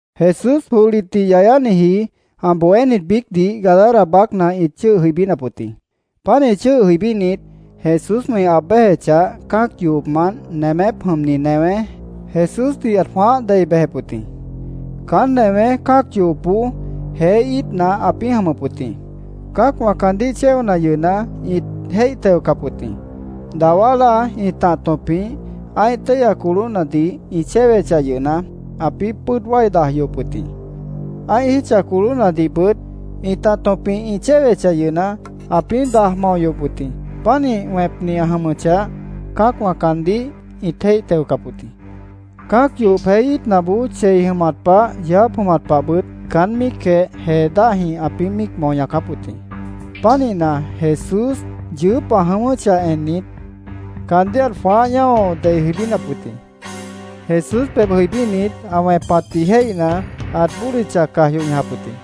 Jesús johlitdih yayániji ã bohénit biícdih Gadara baácna ĩt chʉ́ʉh jʉibínap wʉt jĩ. Pánih chʉ́ʉh jʉibínit, Jesúswã ĩ aab béjechah, cã́ac yohopmant nemépwã jʉmni newé Jesúsdih ãt jwãáh dei bejep wʉt jĩ. Caán newé cã́ac yohopboó jeé íitna ãpĩ́ jʉmʉp wʉt jĩ. Cã́acwã caandíh chéona yʉhna, ĩt jéih teocap wʉt jĩ. Dawá láa ĩtah tõpjĩh ã́ih téihya colóhnadih ĩ chéwechah yʉhna, ãpĩ́ pʉ́ʉd wái daj yohop wʉt jĩ. Ã́ih jítcha colóhnadihbʉt ĩtah tõpjĩh ĩ chéwechah yʉhna, ãpĩ́ daj mao yohop wʉt jĩ. Pánih wẽpni ã jʉmʉchah, cã́acwã caandíh ĩt jéih teocap wʉt jĩ. Cã́ac yohop jeé íitnaboó chei jʉmat pah, yeó jáap jʉmat pahbʉt caán míicjeh jee dáhjĩh ãpĩ́ míic mao ñaacáp wʉt jĩ. Pánihna, Jesús yʉʉ́p ã jʉ̃ʉ́wʉ́chah ennit, caandíh ãt jwãáh ñáo dei jʉibínap wʉt jĩ. Jesús pebh jʉibínit, ã wẽpatdih jéihna, ãt bódicha caj yoh ñajap wʉt jĩ.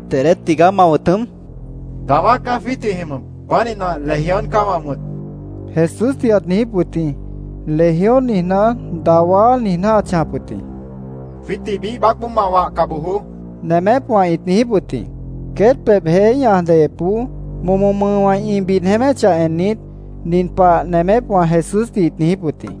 —¿Dedé tigaá ma wʉ̃t jʉm? Jesús ãt niijíp wʉt jĩ. —Dawá caá jwiít jwĩ jʉmʉp. Pánihna, Legión caá wã wʉ̃t, Jesúsdih ãt niijíp wʉt jĩ. “Legión” niijná, “Dawá” niijná ãt chãjap wʉt jĩ. —Jwiítdih biíh baácboó ma wahca bojoó, nemépwã ĩt niijíp wʉt jĩ. Queét pebh, jeé ñaj deyepboó, momo mʉʉwã ĩ bid jeéméchah ennit, nin pah nemépwã Jesúsdih ĩt niijíp wʉt jĩ: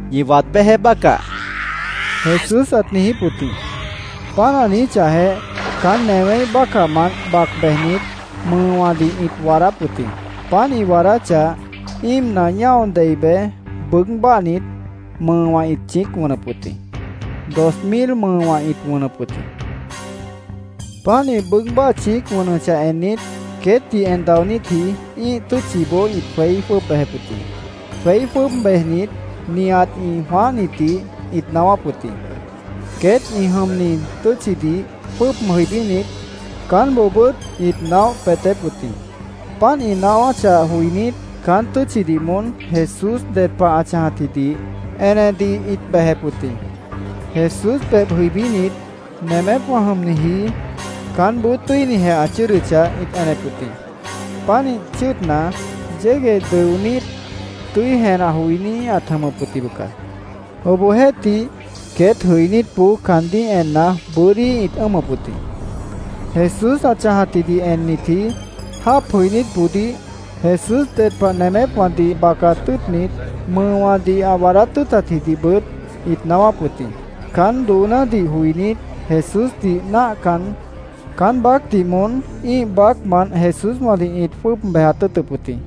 —Ñi waad béjeé bácah, Jesús ãt niijíp wʉt jĩ. Páant ã niijíchahjeh, caán newéíh bácahmant bac bejnit, mʉʉwãdih ĩt waadáp wʉt jĩ. Páant ĩ waadáchah, íimna ñáo dei bej, bʉʉ́g báahnit, mʉʉwã ĩt chĩíc wʉnʉp wʉt jĩ. Dos mil mʉʉwã ĩt wʉnʉp wʉt jĩ. Páant ĩ bʉʉ́g báah chĩíc wʉnʉchah ennit, queétdih en daonítji ĩ́ih tʉ́tchiboó ĩt jweí jwʉ́ʉb bejep wʉt jĩ. Jweí jwʉ́ʉb bejnit, nihat ĩ jwãáhnitdih ĩt naáwáp wʉt jĩ. Queét ĩ jʉmni tʉ́tchidih jwʉ́ʉb jʉibínit, caánboobʉ́t ĩt naóh peetép wʉt jĩ. Páant ĩ naáwáchah joinít, caán tʉ́tchidih moón Jesús ded pah ã chãjatjidih enedih ĩt bejep wʉt jĩ. Jesús pebh jʉibínit, nemépwã jʉmniji caánboó tʉ́inijeh ã chʉ́ʉdʉchah, ĩt enep wʉt jĩ. Pánih chʉ́ʉdna, yégueh dʉonít, tʉ́i jenah joiní ãt jʉmʉp wʉt jĩ, bʉca. Obohjeéhtih, queét jʉibínitboó caandíh enna, bʉ́dí ĩt ʉ́ʉmʉp wʉt jĩ. Jesús ã chãjatjidih ennitji jáap jʉinítboodíh Jesús ded pah nemépwãdih bacat tʉ́ʉtnit, mʉʉwãdih ã waadát tʉ́ʉtatjidihbʉt ĩt naáwáp wʉt jĩ. Caán doonádih joinít, Jesúsdih náahcan, caán baácdih moón ĩ́ih baácmant Jesúswãdih ĩt jwʉ́ʉb bejat tʉ́ʉtʉp wʉt jĩ.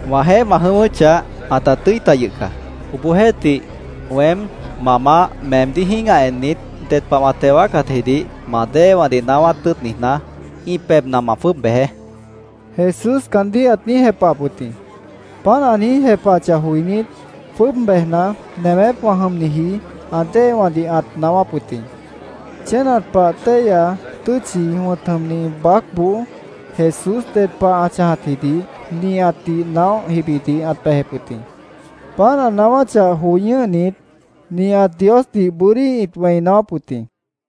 —Wãjeéh ma jʉ̃ʉ́wʉ́chah, ãta tʉ́i ta yʉh caá. Obohjeéhtih, weém, ma Maáh, meemdíh jĩ́gah ennit, ded pah wã teo wáacatjidih ma déewãdih naáwát tʉ́ʉt niijná, ĩ pebhna ma jwʉ́ʉb bejeé, Jesús caandíh ãt niíj jepahap wʉt jĩ. Páant ã niíj jepahachah joinít, jwʉ́ʉb bejna, nemépwã jʉmniji ã déewãdih ãt naáwáp wʉt jĩ. Chénat Pah Téihya Tʉ́tchi wʉ̃t jʉmni baácboó Jesús ded pah ã chãjatjidih nihatdih naóh jibidih ãt bejep wʉt jĩ. Páant ã naáwáchah joi ñʉ́hnit, nihat Diosdih bʉ́dí ĩt wẽi naáwáp wʉt jĩ.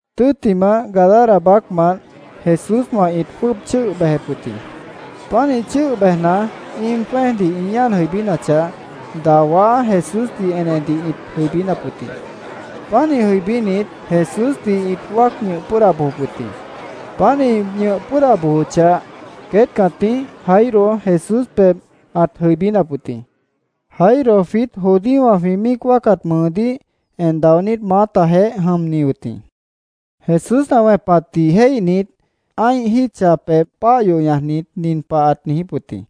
Tʉ́ttimah, Gadara baácmant Jesúswã ĩt jwʉ́ʉb chʉ́ʉh bejep wʉt jĩ. Pánih chʉ́ʉh bejna, íim jwẽ́ejdih ĩ ñáan jʉibínachah, dawá Jesúsdih enedih ĩt jʉibínap wʉt jĩ. Pánih jʉibínit, Jesúsdih ĩt wáac ñʉh pʉ́ʉda bojop wʉt jĩ. Páant ĩ ñʉh pʉ́ʉda bojochah, queét cãtíh Jairo Jesús pebh ãt jʉibínap wʉt jĩ. Jairo jwiít judíowã jwĩ míic wáacat mʉʉdíh en daonít maátajeéh jʉmni wʉt jĩ. Jesús ã wẽpatdih jéihnit, ã́ih jítcha pebh páah yoh ñajnit, nin pah ãt niijíp wʉt jĩ: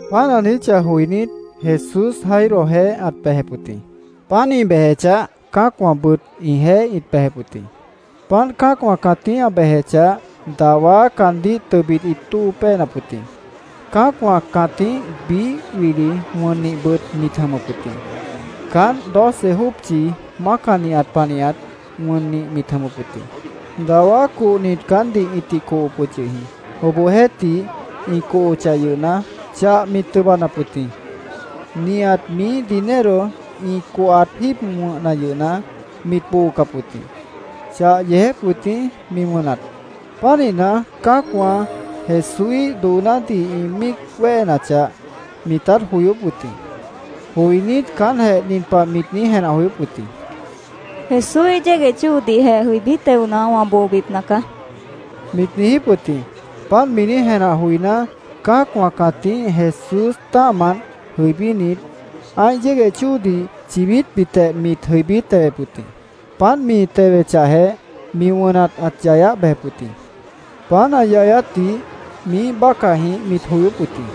Páant ã niijíchah joinít, Jesús Jairojeéh ãt bejep wʉt jĩ. Páant ĩ bejechah, cã́acwãbʉt ĩjeéh ĩt bejep wʉt jĩ. Páant cã́acwã cãtíh ã bejechah, dawá caandíh tʉbit ĩt tóo péenap wʉt jĩ. Cã́acwã cãtíh biíh wili wʉnnihbʉt mit jʉmʉp wʉt jĩ. Caánt doce jópchi mácanihat panihat wʉnnih mit jʉmʉp wʉt jĩ. Dawá cohnit caántdih ĩtih cohop wʉt yʉh jĩ. Obohjeéhtih ĩ cohochah yʉhna, chah mit tʉbanap wʉt jĩ. Nihat miíh dinero ĩ cohat jíib wʉ̃hna yʉhna, mit boocap wʉt jĩ. Chah yeejép wʉt jĩ mi wʉnat. Pánihna, cã́acwã Jesúíh doonádih ĩ míic wéhenachah, mitát joyóp wʉt jĩ. Joinít, caántjeh nin pah mit niíj jenah joyóp wʉt jĩ: “Jesúíh yégueh chóodihjeh jʉibí teona, wã boobipna caá”, mit niijíp wʉt jĩ. Páant niíj jenah joiná, cã́acwã cãtíh Jesús tã́ahmant jʉibínit, ã́ih yégueh chóodih chaíhbitjeh mit jʉibí tewep wʉt jĩ. Páant mi tewechahjeh, mi wʉnat ãt yayáh bejep wʉt jĩ. Páant ã yayátdih miíh bácahjĩh mit joyóp wʉt jĩ.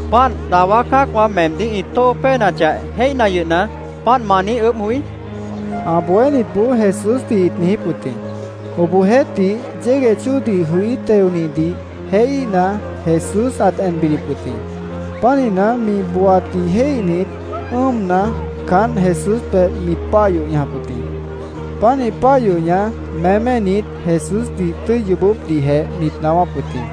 —¿Páant, dawá cã́acwã meemdíh ĩ tóo péenachah jéihna yʉhna, páant ma niíj ʉʉ́bh joí? ã bohénitboó Jesúsdih ĩt niijíp wʉt jĩ. Obohjeéhtih, yégueh chóodih jʉí, teonidih jéihíhna, Jesús ãt en bidip wʉt jĩ. Pánihna, mi booatdih jéihnit, ʉ́ʉmna, caánt Jesús pebh mit páah yoh ñajap wʉt jĩ. Pánih páah yoh ñaj, méménit, Jesúsdih tʉ́i yoobópdihjeh mit naáwáp wʉt jĩ.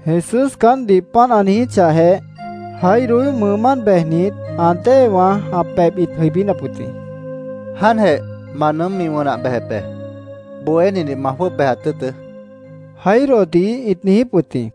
Jesús caántdih páant ã niijíchahjeh, Jairoíh mʉʉmánt bejnit, ã déewã ã pebh ĩt jʉibínap wʉt jĩ. —Jáantjeh ma nʉʉ́m mi wʉnah bejep be. Bohénidih ma jwʉ́ʉb bejat tʉ́ʉtʉ́, Jairodih ĩt niijíp wʉt jĩ.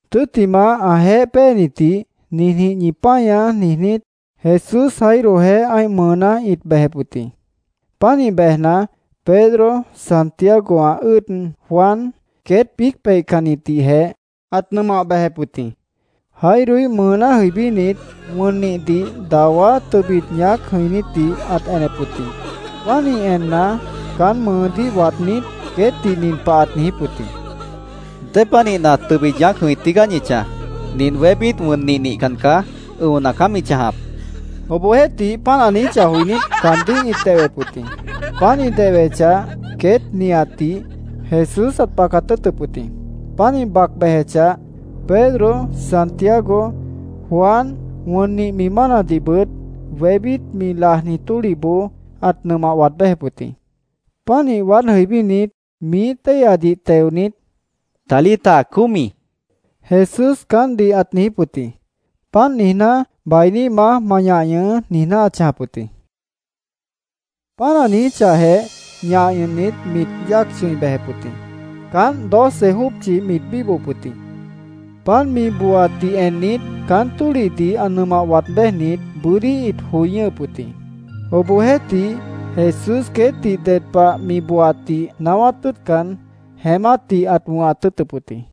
Tʉ́ttimah, ãjeéh péenitdih “Ninjĩh ñi páñaá”, niijnít, Jesús Jairojeéh ã́ih mʉʉná ĩt béjep wʉt jĩ. Pánih bejna, Pedro, Santiago, ã ʉ́ʉd Juan, queét biíc peihcannitdihjeh ãt nʉmah bejep wʉt jĩ. Jairoíh mʉʉná jʉibínit, wʉnnihdih dawá tʉbit ñaác jʉ̃inítdih ãt enep wʉt jĩ. Pánih enna, caán mʉʉdíh waadnít, queétdih nin pah ãt niijíp wʉt jĩ: —¿Dépanihna tʉbit ñaác jʉ̃i tígaá ñi chãj? Nint wébít wʉnnih nihcan caá. Ʉ̃ona caá mi chãjap, ãt niijíp wʉt jĩ. Obohjeéhtih, páant ã niijíchah joinít, caandíh ĩt dehwep wʉt jĩ. Páant ĩ dehwechah, queét nihatdih Jesús ãt bacat tʉ́ʉtʉp wʉt jĩ. Páant ĩ bac bejechah, Pedro, Santiago, Juan, wʉnnih mi mánadihbʉt wébít mi lajni tólihboó ãt nʉmah waad béjep wʉt jĩ. Pánih waád jʉibínit, miíh téihyadih teonit, —¡Talita cumi! Jesús caántdih ãt niijíp wʉt jĩ. Páant niijná, “Bainíhmaá, ma ñah ñʉhʉʉ́”, niijná ãt chãjap wʉt jĩ. Páant ã niijíchahjeh, ñah ñʉhnit, mit yáac chʉ̃i bejep wʉt jĩ. Caánt doce jópchi mit bíbohop wʉt jĩ. Páant mi booatdih ennit, caán tólihdih ã nʉmah waad béjnit bʉ́dí ĩt joi ñʉ́hʉp wʉt jĩ. Obohjeéhtih, Jesús queétdih ded pah mi booatdih naáwát tʉ́ʉtcan, jeémátdih ãt wʉ̃hat tʉ́ʉtʉp wʉt jĩ.